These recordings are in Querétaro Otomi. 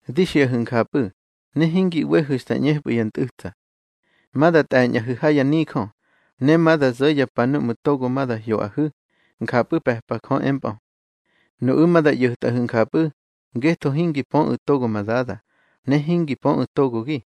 Di xiꞌahu̱ njapꞌu̱, ne hingi ꞌwehu̱ xta ꞌñepꞌu̱ ya ntꞌu̱tsa. Ma da tꞌe̱ñꞌahu̱ ha ya nijö, ne ma da zo̱ ya pa núꞌmu̱ togo ma da hyoꞌahu̱, njapꞌu̱ pe̱pa Jö empꞌö. Nuꞌu̱ ma da ꞌyo̱tꞌahu̱ njapꞌu̱, ngetho hingi pöꞌu̱ togo ma Dada, ne hingi pöꞌu̱ togogi.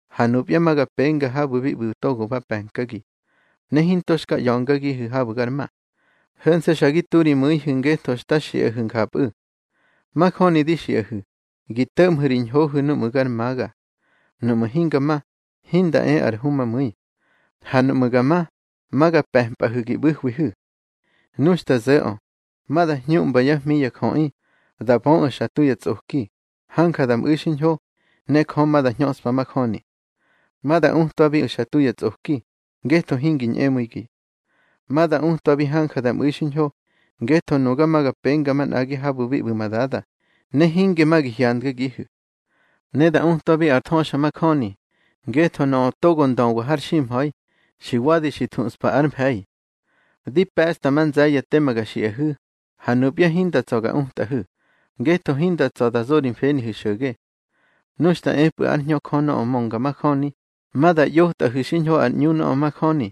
Ha nupya ma ga penga habu̱ bi ꞌbu̱ togo ba pe̱nkagi. Ne hinto xka ꞌya̱ngagihu̱ habu̱ gar ma. Ho̱nse̱ xa gi tu ri mu̱ihu̱ ngetho xta xiꞌahu̱ njapꞌu̱. Majöni di xiꞌahu̱, gi to̱ꞌmhu̱ ri ñhohu̱ nuꞌmu̱ gar maga. Nuꞌmu̱ hinga ma, hinda e ar Humamu̱i. Ha nuꞌmu̱ ga ma, ma ga pe̱mpꞌahu̱ gi ꞌbu̱hwihu̱. Nu xta zo̱ꞌö, ma da hñuꞌmba yá hmi ya jöꞌi, da böꞌu̱ xa tu yá tsꞌoki, hanja da mꞌu̱ xiñho, ne Jö ma da hñöꞌspa majöni. Ma da utwabiꞌu̱ xa tu ya tsꞌoki, ngetho hingi ñꞌemu̱igi. Ma da utwabi hanja da mꞌu̱i xiñho, ngetho nuga ma ga penga manꞌagi habu̱ bi ꞌbu̱ ma Dada, ne hinge ma gi hyandgagihu̱. Ne da utwabi ar thöxamajöni, ngetho nöꞌö togo ndöwa har ximha̱i, xi wadi xi thuꞌspa ár mfe̱i. Di pe̱ꞌsta ma nze̱ye̱ tema ga xiꞌahu̱, ha nupya hinda tsa̱ ga utꞌahu̱, ngetho hinda tsa̱ da zo ri mfenihu̱ xo̱ge. Nu xta epꞌu̱ ár Hñö Jö nöꞌö mönga majöni, ma da ꞌyotꞌahu̱ xiñho ar ꞌñu nöꞌö majöni.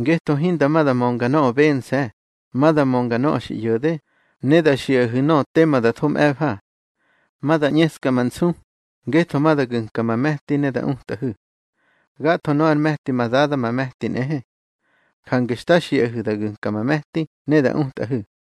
Ngetho hinda ma da mönga nöꞌö bense̱, ma da mönga nöꞌö xi ꞌyo̱de, ne da xiꞌahu̱ nöꞌö tema da tho mꞌe̱fa. Ma da ꞌñeska ma nsu, ngetho ma da gu̱nka ma me̱ti ne da utꞌahu̱. Gatho nöꞌö ár me̱ti ma Dada ma me̱ti nꞌehe, jange xta xiꞌahu̱ da gu̱nka ma me̱ti ne da utꞌahu̱.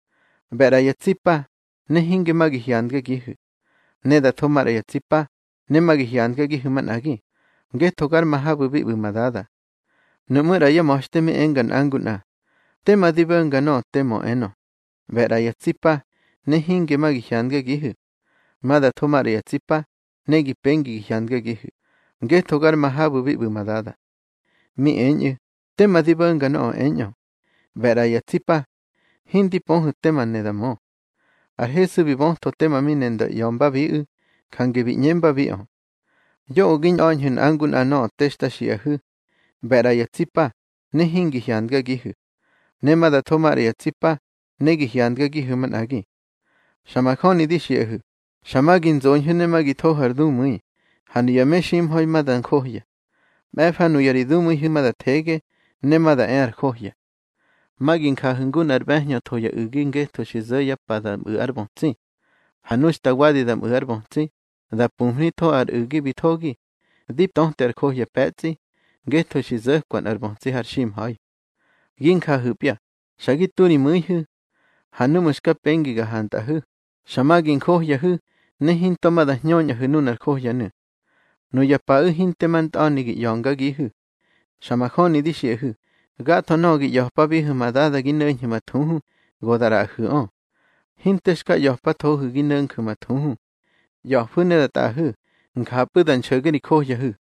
ꞌBe̱ ꞌra ya tsi pa, ne hinge ma gi hyandgagihu̱. Ne da tho maꞌra ya tsi pa, ne ma gi hyandgagihu̱ manꞌagi, ngetho gar ma habu̱ bi ꞌbu̱ ma Dada. Nuꞌmú̱ ꞌra yá ma̱xte mi enga nꞌa ngu nꞌa: —Tema di bo̱nga nöꞌö te mö enö: ꞌBe̱ ꞌra ya tsi pa, ne hinge ma gi hyandgagihu̱. Ma da tho maꞌra ya tsi pa, ne gi pengi gi hyandgagihu̱, ngetho gar ma habu̱ bi ꞌbu̱ ma Dada. Mi eñꞌu̱: —Tema di bo̱nga nöꞌö eñꞌö: ꞌBe̱ ꞌra ya tsi pa. Hindi pöhu̱ tema ne da mö. Ar Hesu bi bötho tema mi ne nda ꞌya̱mbabiꞌu̱, jange bi ꞌñembabiꞌö: —Yoꞌö gi ñꞌa̱ñhu̱ nꞌa ngu nꞌa nöꞌö te xta xiꞌahu̱: ꞌBe̱ ꞌra ya tsi pa, ne hingi hyandagihu̱. Ne ma da tho maꞌra ya tsi pa, ne gi hyandgagihu̱ manꞌagi. Xa majöni di xiꞌahu̱, xa ma gi nzoñhu̱ ne ma gi thohu̱ ar dumu̱i, ha nuya meximha̱i ma da njohya. Mꞌe̱fa nuna ri dumu̱ihu̱ ma da thege, ne ma da e ar johya. Ma gi njahu̱ ngu nꞌar ꞌbe̱hñö tho ya u̱gi ngetho xi zo̱ yá pa da mꞌu̱ ár bötsi. Ha nu xta wadi da mꞌu̱ ár bötsi, da pumhnitho ar u̱gi bi thogi, di töte ar johya pe̱tsꞌi, ngetho xi zo̱kwa nꞌar bötsi har ximha̱i. Gi njahu̱pya, xa gi tu ri mu̱ihu̱. Ha núꞌmu̱ xka pengi ga hantꞌahu̱, xa ma gi njohyahu̱, ne hinto ma da hñöñꞌahu̱ nunar johyanu̱. Nuya paꞌu̱ hinte ma ntꞌa̱ni gi ꞌya̱ngagihu̱. Xa majöni di xiꞌahu̱, gatho nöꞌö gi ꞌya̱pabihu̱ ma Dada gi no̱nju̱ ma thuhu, go da ꞌraꞌahu̱ꞌö. Hinte xka ꞌya̱pathohu̱ gi no̱nju̱ ma thuhu. ꞌYa̱fu̱ ne da tꞌaꞌahu̱, njapꞌu̱ da nxo̱ge ri johyahu̱.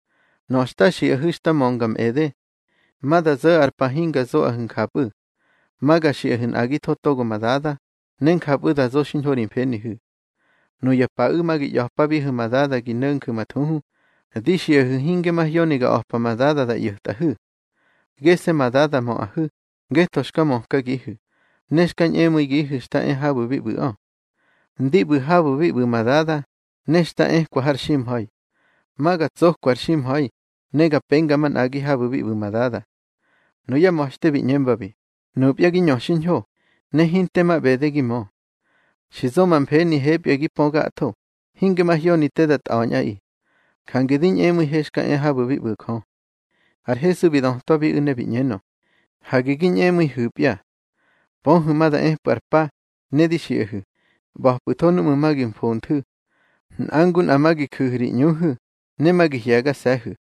Nöꞌö xta xiꞌahu̱ xta mönga mꞌede. Ma da zo̱ ar pa hinga zoꞌahu̱ njapꞌu̱. Ma ga xiꞌahu̱ nꞌagitho togo ma Dada, ne njapꞌu̱ da zo xiñho ri mfenihu̱. Nuya paꞌu̱ ma gi ꞌya̱pabihu̱ ma Dada gi no̱nju̱ ma thuhu. Di xiꞌahu̱ hinge mahyoni ga a̱pa ma Dada da ꞌyo̱tꞌahu̱. Gese̱ ma Dada möꞌahu̱, ngetho xka mökagihu̱, ne xka ñꞌemu̱ihu̱ xta e habu̱ bi ꞌbu̱ꞌö. Ndi ꞌbu̱ habu̱ bi ꞌbu̱ ma Dada, ne xta ekwa har ximha̱i. Ma ga tsokwa ar ximha̱i, ne ga penga manꞌagi habu̱ bi ꞌbu̱ ma Dada. Nuyá ma̱xte bi ꞌñembabi: —Nupya gi ñö xiñho, ne hinte ma ꞌbede gi mö. Xi zo ma mfenihepya gi pö gatho, hinge mahyoni te da tꞌa̱ñꞌaꞌi. Jange di ñꞌemu̱ihe xka e habu̱ bi ꞌbu̱ Jö. Ar Hesu bi dötwabiꞌu̱ ne bi ꞌñenö: —Hage gi ñꞌemu̱ihu̱pya. Pöhu̱ ma da epꞌu̱ ar pa, ne di xiꞌahu̱, ꞌba̱pꞌu̱tho núꞌmu̱ ma gi mfonthu̱. Nꞌa ngu nꞌa ma gi ju̱hu̱ ri ꞌñuhu̱, ne ma gi hye̱gase̱hu̱.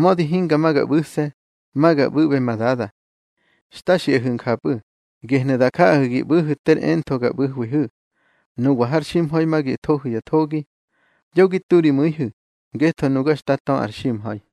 Mödi hinga ma ga ꞌbu̱se̱, ma ga ꞌbu̱ꞌbe ma Dada. Xta xiꞌahu̱ njapꞌu̱, gehnu̱ da jaꞌahu̱ gi ꞌbu̱hu̱ ter entho ga ꞌbu̱hwihu̱. Nuwa har ximha̱i ma gi thohu̱ ya thogi. Yo gi tu ri mu̱ihu̱, ngetho nuga xta tö ar ximha̱i.